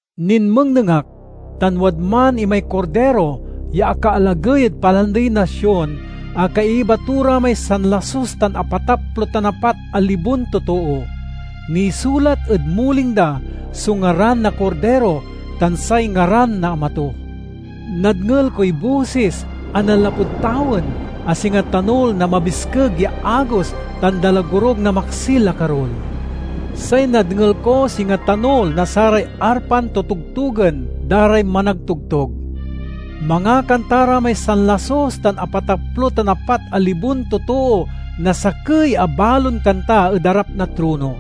Ninmengneng ak, tan wadman imay Kordiro ya akaalagey ed Palandey na Sion a kaiba to ra may sanlasus tan apataplo tan apat a libon totoo. Nisulat ed muling da so ngaran na Kordiro tan say ngaran na Ama to. Nadngel koy bosis a nanlapud tawen a singa tanul na mabiskeg ya agos tan dalagorug na maksil a karul. Say nadngel ko singa tanul na saray arpan totogtogen da ray managtogtog. Mangakanta ra may sanlasus tan apataplo tan apat a libon totoo na sakey a balon kanta ed arap na trono,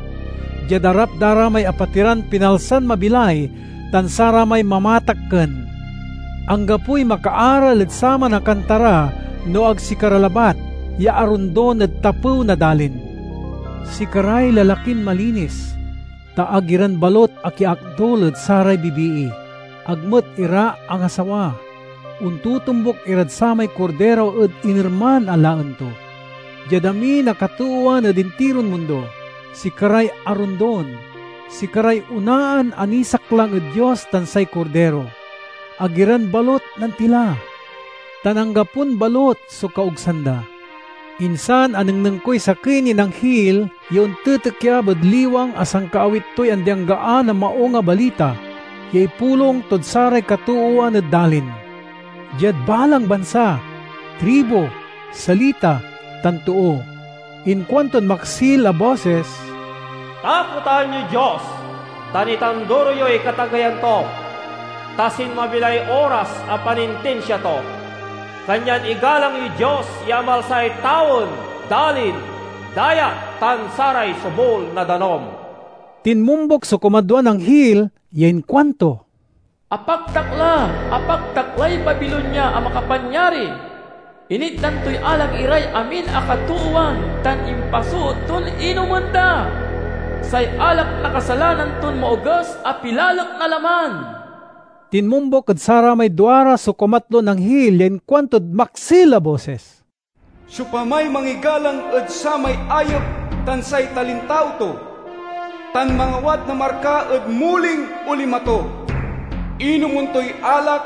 diad arap da ra may apatiran pinalsan mabilay tan saramay mamatakken. Anggapoy makaaral ed saman a kanta ra no ag sikara labat ya arondon ed tapew na dalin. Sikaray lalakin malinis, ta ag iran balut akiakdul ed saray bibii; ag met ira angasawa. Ontotombuk irad samay Kordiro ed inerman a laen to. Diad amin a katoowan ed intiron mundo, sikaray arondon; sikaray onaan a nisaklang ed Dios tan say Kordiro. Ag iran balut nantila, tan anggapon balut so kaogsan da. Insan anengneng koy sakey nin anghil ya ontitikyab ed liwang a sankaawit toy andi-anggaan a Maung a Balita ya ipulong tod saray katoowan ed dalin, diad balang bansa, tribu, salita, tan too. Inkuantod maksil a bosis, "Takotan yoy Dios, tan itanduro yoy katageyan to! Ta sinmabi lay oras a panintinsia to. Kanyan igalang yoy Dios ya amalsay tawen, dalin, dayat, tan saray sobul na danum!" Tinmombuk so kumadwan anghil ya inkuanto, "Apaktak la! Apaktak lay Babilonia a makapanyari! Initdan toy alak iray amin a katoowan tan impasoot ton inomen da—say alak na kasalanan ton maoges a pilalek na laman!" Tinmombuk ed saramay duara so kumatlon anghil ya inkuantod maksil a bosis, "Siopamay mangigalang ed samay ayep tan say talintao to, tan mangawat na marka ed muling o lima to, inomen toy alak,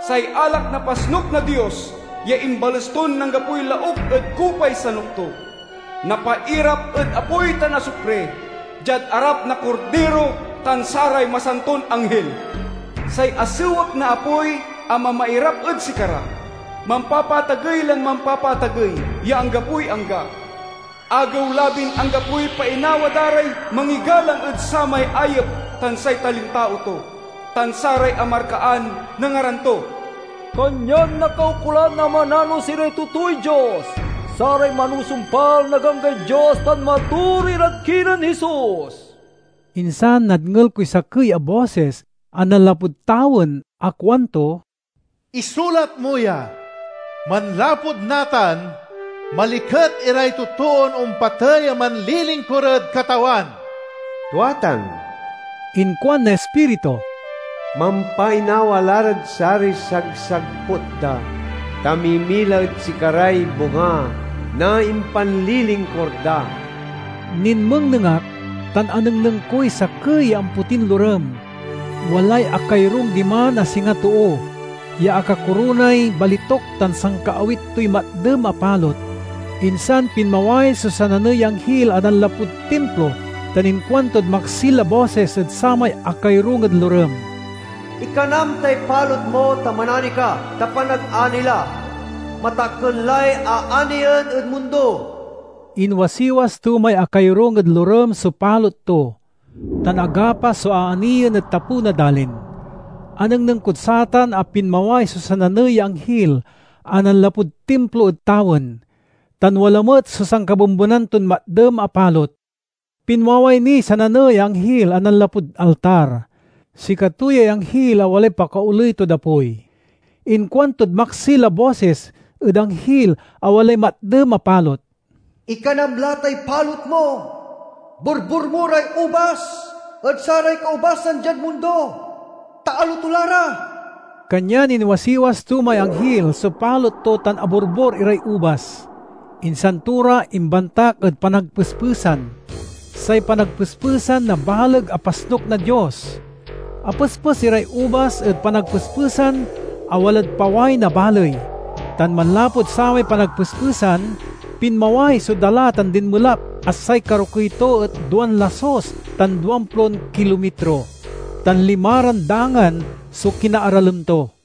say alak na pasnuk na Dios ya imbales ton anggapoy lauk ed kupay sanuk to! Napairap ed apoy tan asupri diad arap na Kordiro tan saray masanton anghil. Say asewek na apoy a mamairap ed sikara mampapaatagey lan mampapaatagey ya anggapoy angga. Agew-labin anggapoy painawa da ray mangigalang ed samay ayep tan say talintao to, tan saray amarkaan na ngaran to." Kanyan nakaukolan a mananos iray totooy Dios, saray manusumpal na ganggay Dios tan matoor irad kinen Jesus. Insan nadngel koy sakey a bosis a nanlapud tawen a kuanto, "Isulat mo ya: Manlapud natan, maliket iray totoon ompatey a manlilingkur ed Katawan!" "Tua tan," inkuan na Ispiritu. "Mampainawa la rad saray sagsagput da, ta mimila ed sikaray bunga na impanlilingkur da." Ninmengneng ak, tan anengneng koy sakey ya ampotin lorem. Walay akayorung diman a singa too, ya akakoronay balituk tan sankaawit toy matdem a palot. Insan pinmaway so sananey ya anghil a nanlapud timplo tan inkuantod maksil a bosis ed samay akayorung ed lorem, "Ikanam tay palot mo tan manani ka, ta panagani la. Matakken lay aaniyen ed mundo!" Inwasiwas to may akayorung ed lorem so palot to, tan agapas so aaniyen ed tapew na dalin. Anengneng kod satan a pinmaway so sananey ya anghil a nanlapud timplo ed tawen, tan wala met so sankabembenan ton matdem a palot. Pinmaway niy sananey ya anghil a nanlapud altar. Sikato yay anghil a walay pakaoley tod apoy. Inkuantod maksil a bosis ed anghil a walay matdem a palot, "Ikanam la tay palot mo. Borbor mo ray ubas ed saray kaubasan diad mundo, ta aloto la ra!" Kanyan inwasiwas to may anghil so palot to tan aborbor iray ubas, insan to ra imbantak ed panagpespesan—say panagpespesan na baleg a pasnuk na Dios. Apespes iray ubas ed panagpespesan a walad paway na baley, tan manlapud samay panagpespesan, pinmaway so dala tan dinmelap a say karokey to et duan lasus tan duamplon kilomitro, tan limaran dangan so kinaaralem to.